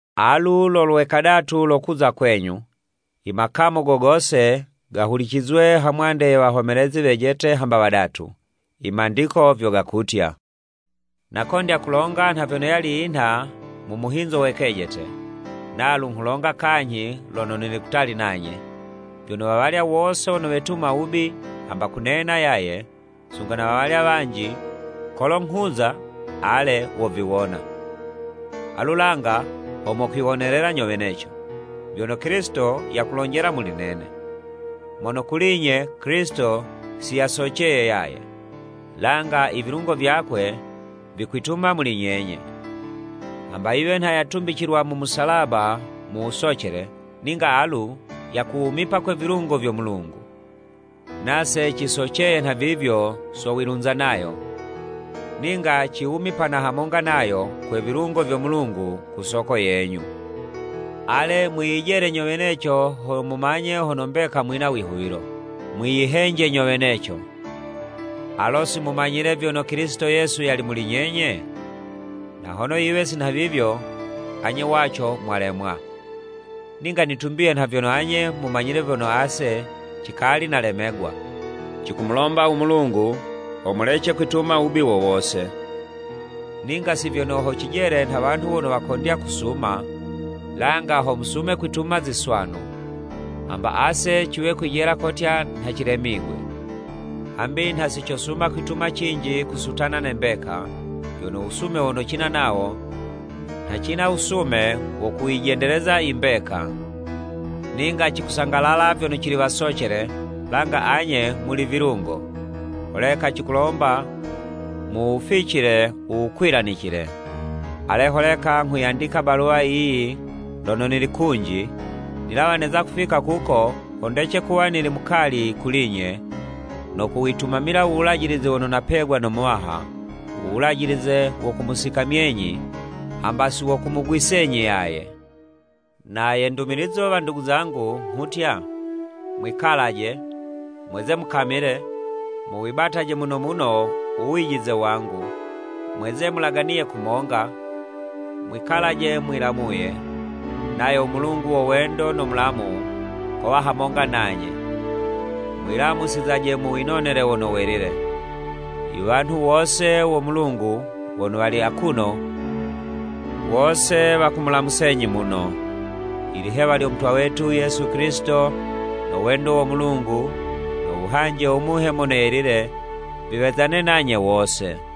Alu lo lwe kadatu lo kuza kwenyu. “I makamu go gose, gahulicizwe hamwande ye wahomelezi wejete hamba wadatu.” I Mandiko vyo gakutya. Nakondya kulonga nha vyono yali yinha mu muhinzo we kejete, nalu nghulonga kanyhi lono nili kutali nanye, vyono wawalya wose wono wetuma wubi hamba kunena yaye, sunga na wawalya wanji, kolo nghuza, ale woviwona. Alu langa ho mokwiwonelela nyo weneco, vyono Kilisito yakulonjela muli nene. Mono kuli'nye, Kilisito si yasoceye yaye, langa i vilungo vyakwe vikwituma muli nyenye. Hamba yiwe nha yatumbicilwa mu musalaba mu wusocele, ninga alu yakuwumipa kwe vilungo vyo Mulungu. Nase cisoceye nhavivyo so wilunza nayo, ninga ciwumipana hamonga nayo kwe vilungo vyo Mulungu ku soko yenyu. Ale mwiyijele nyo weneco ho mumanye hono mbeka mwina wihuwilo. Mwiyihenje nyo weneco. Alo si mumanyile vyono Kilisito Yesu yali muli nyenye? Na hono yiwe si nhavivyo, anye waco mwalemwa. Ninga nitumbiye nha vyono anye mumanyile vyono ase cikali nalemegwa. Cikumulomba u Mulungu, ho mulece kwituma wubi wo wose, ninga si vyono ho cijele nha wanhu wono wakondya kusuma, langa ho musume kwituma ziswanu, hamba ase ciwe kwijela kotya nha cilemigwe. Hambi nha si cosuma kwituma cinji kusutana ne mbeka, vyono u wusume wono cina nawo, nha cina wusume wo kuyijendeleza mbeka. Ninga cikusangalala vyono cili wasocele, langa anye muli vilungo, holeka cikulomba muwuficile u wukwilanicile. Ale holeka nghuyandika baluwa yiyi lono nili kunji, nilawa neza kufika kuko, ho ndece kuwa nili mukali kuli'nye no kuwitumamila u wulajilize wono napegwa no Muwaha, u wulajilize wo kumusikamyenyi hamba si wo kumugwisenyi yaye. Na ye ndumilizo, wandugu zangu, nghutya, mwikalaje! Mweze mukamile, muwibataje muno muno u wijize wangu, mweze mulaganiye kumonga, mwikalaje mwilamuye. Nayo u Mulungu wo wendo no mulamu, kowa hamonga nanye. Mwilamusizaje mu winonele wono welile. I wanhu wose wo Mulungu wono wali akuno, wose wakumulamusenyi muno. Ilihewa lyo Mutwa wetu Yesu Kilisito, no wendo wo Mulungu, no wuhanje wo Muhe Mono Yelile, viwezane nanye wose.